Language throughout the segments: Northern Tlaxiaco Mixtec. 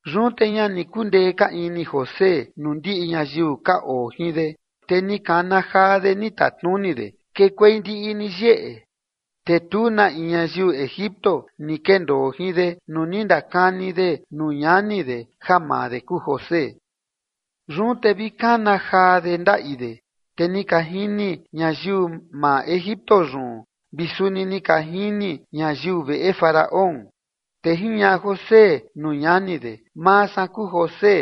Yun te ña ni kundee ka ini José nuu ndiꞌi ñayiu ka oo jin de, te ni kana jaa de, ni tatnuni de: ―Kekuei ndiꞌi ni yeꞌe. Te tu na in ñayiu Egipto ni kendoo jin de nuu ni ndakani de nuu ñani de ja maa de kuu José. Yun te vi kana jaa de ndaꞌi de, te ni ka jini ñayiu maa Egipto yun, vi suni ni ka jini ñayiu veꞌe Faraón. Te jiñaꞌa José nuu ñani de: ―Maa san kuu José.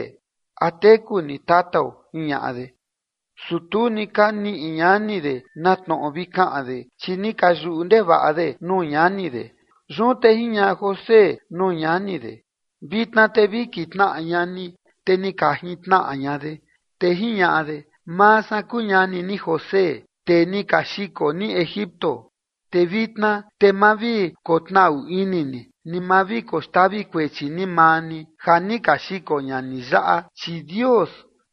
¿A teku ni tatao? ―jiñaꞌa de. Su tu ni ka niꞌi ñani de na tnoꞌo vi kaꞌan de, chi ni ka yuꞌu ndevaꞌa de nuu ñani de. Yun te jiñaꞌa José nuu ñani de: ―Vitna te vi kitnaꞌa ña ni. Te ni ka jintnaꞌa ña de. Te jiñaꞌa de: ―Maa san kuu ñani ni José, tee ni ka xiko ni Egipto. Te vitna te ma vi kotnaꞌu ini ni, ni ma vi koxtavi kuechi ni maa ni ja ni ka xiko ña ni yaꞌa, chi Dios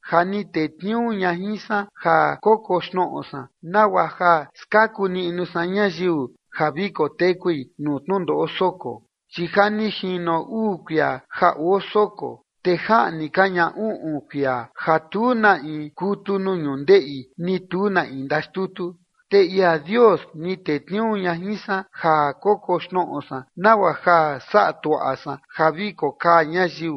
ja ni tetniuu ña jin san ja kokoxnoꞌo san, nagua ja skaku niꞌnu san ñayiu ja vi kotekui nuu tnundoꞌo soko. Chi ja ni jino uu kuia ja oo soko, te jaꞌni ka ña uꞌun kuia ja tu na in kutu nuu ñundeꞌi, ni tu na in ndaxtutu. Te ia Dios ni tetniuu ña jin san ja kokoxnoꞌo san, nagua ja saꞌa tuaꞌa san ja vi kokaa ñayiu,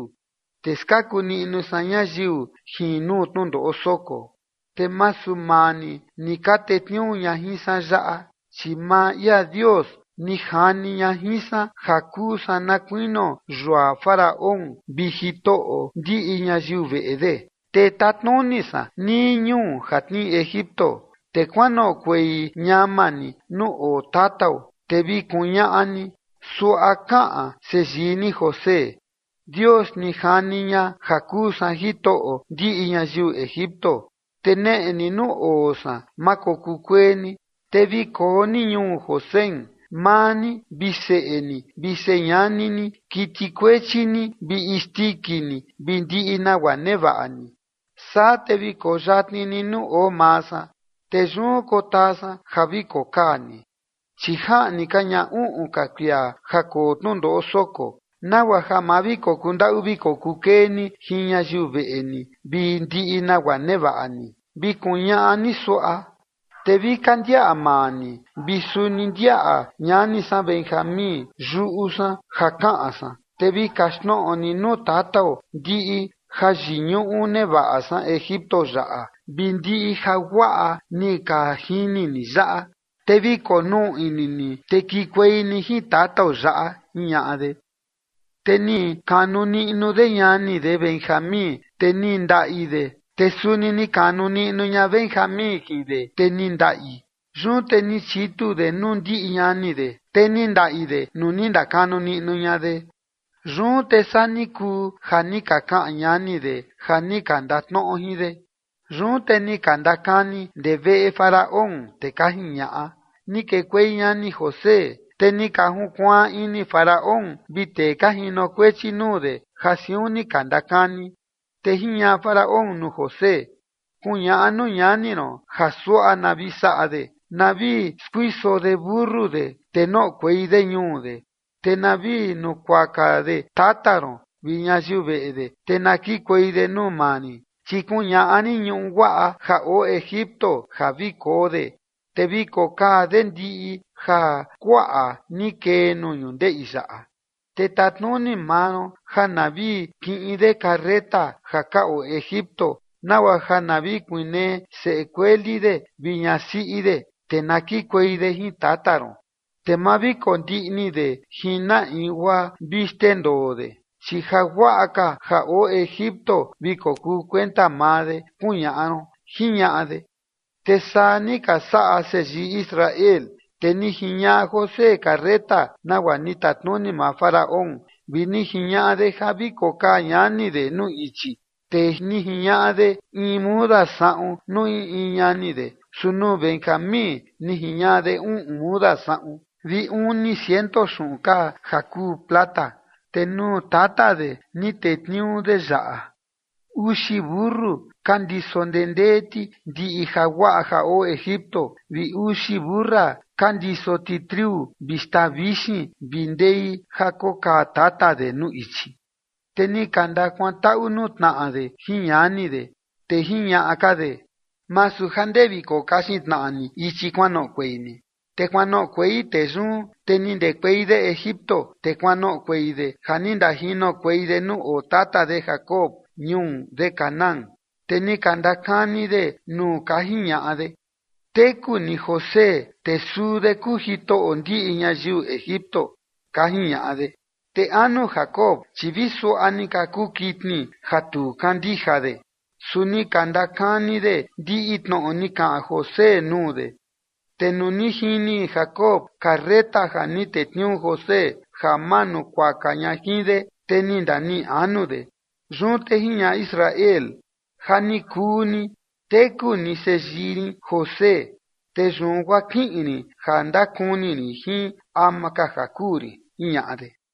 te skaku niꞌnu san ñayiu jin nuu tnundoꞌo soko. Te masu maa ni, ni ka tetniuu ña jin san yaꞌa, chi maa ia Dios ni jani ña jin san ja kuu san na kuinio yua Faraón vi jitoꞌo ndiꞌi ñayiu veꞌe de, te tatnuni san nii ñuu ja tnii Egipto. Te kuanoꞌokuei ñama ni nuu oo tatao, te vi kuñaꞌa ni: “Suaꞌa kaꞌan seyii ni José: Dios ni jani ña ja kuu san jitoꞌo ndiꞌi ñayiu Egipto, te neꞌe ni nuu oo san, ma kokuu kuee ni. Te vi koo ni ñuu Gosén, maa ni vi seꞌe ni vi señani ni, kiti kuechi ni vi isndiki ni vi ndiꞌi nagua nevaꞌa ni. Saa te vi koo yatni ni nuu oo maa san. Te yun kotaa san ja vi kokaa ni, chi jaꞌni ka ña uꞌun ka kuia ja koo tnundoꞌo soko, nagua ja ma vi kokuu ndaꞌu kokuu kee ni jin ñayiu veꞌe ni vi ndiꞌi nagua nevaꞌa ni”, vi kuñaꞌa ni suaꞌa. Te vi ka ndiaꞌa maa ni vi suni ndiaꞌa ñani san Benjamín yuꞌu san ja kaꞌan san. Te vi kaxtnoꞌo ni nuu tatao ndiꞌi jayiñuꞌu nevaꞌa san Egipto yaꞌa vi ndiꞌi jaguaꞌa ni ka jini ni yaꞌa. Te vi konuu ini ni, te kikuei ni jin tatao yaꞌa ―jiñaꞌa de. Te ni kanu niꞌnu de ñani de Benjamín, te ni ndaꞌi de, te suni ni kanu niꞌnu ña Benjamín jin de, te ni ndaꞌi. Yun te ni chitu de nuu ndiꞌi ñani de, te ni ndaꞌi de nuu ni ndakanu niꞌnu ña de. Yun te saa ni kuu ja ni ka kaꞌan ñani de ja ni ka ndatnoꞌo jin de. Yun te ni ka ndakani ndee veꞌe Faraón, te ka jiñaꞌa: ―Ni kekuei ñani José. Te ni ka junkuaan ini Faraón vi tee ka jinokuechi nuu de ja siun ni ka ndakani. Te jiñaꞌa Faraón nuu José: ―Kuñaꞌa nuu ñani ron ja suaꞌa na vi saꞌa de: Na vi skuiso de mentu de te noꞌokuei de ñuu de, te na vi nukuaka de tata ron vi ñayiu veꞌe de, te na kikuei de nuu maa rin, chi kuñaꞌa rin ñuꞌu guaꞌa ja oo Egipto ja vi koo de, te vi kokaa de ndiꞌi jakuaꞌa ni kee nuu ñundeꞌi yaꞌa. Te tatnuni maa ron ja na vi kiꞌin de carreta ja ka oo Egipto, nagua ja na vi kuinee seꞌe kueli de vi ñasiꞌi de, te na kikuei de jin tata ron. Te ma vi kondiꞌni de jin na in guaa vi xndendoo de, chi jaguaꞌa ka ja oo Egipto vi kokuu kuenta maa de, kuñaꞌa ron ―jiñaꞌa de. Te saa ni ka saꞌa seyii Israel, te ni jiñaꞌa José carreta nagua ni tatnuni maa Faraón, vi ni jiñaꞌa de ja vi kokaa ñani de nuu ichi. Te ni jiñaꞌa de in muda saꞌun nuu in in ñani de, su nuu Benjamín ni jiñaꞌa de uꞌun muda saꞌun vi uni ciento xuꞌun kaa ja kuu plata. Te nuu tata de ni tetniuu de yaꞌa: Uxi mentu ka ndiso ndendee ti ndiꞌi jaguaꞌa ja oo Egipto vi uxi mentu siꞌi ka ndiso ti triu vi xtaa vixin vi ndei ja kokaa tata de nuu ichi. Te ni ka ndakuantaꞌu nuu tnaꞌa de jin ñani de, te jiñaꞌa ka de: ―Masu ja ndee vi kokaxin tnaꞌa ni ichi kuanoꞌokuei ni. Te kuanoꞌokuei tee yun. Te ni ndekuei de Egipto, te kuanoꞌokuei de ja ni ndajinokuei de nuu oo tata de Jacob ñuu de Canaán. Te ni ka ndakani de nuu ka jiñaꞌa de: ―Teku ni José, te suu de kuu jitoꞌo ndiꞌi ñayiu Egipto ―ka jiñaꞌa de. Te anu Jacob, chi vi suaꞌa ni ka kuu kitni ja tu kandija de. Su ni ka ndakani de ndiꞌi tnoꞌo ni kaꞌan José nuu de, te nuu ni jini Jacob carreta ja ni tetniuu José ja majunkuaka ña jin de, te ni ndaniꞌi anu de. Yun te jiñaꞌa Israel: ―Ja ni kuu ni, teku ni seyii rin José, te yun guaa kiꞌin rin ja ndakuni rin jin ama ka ja kuu rin ―jiñaꞌa de.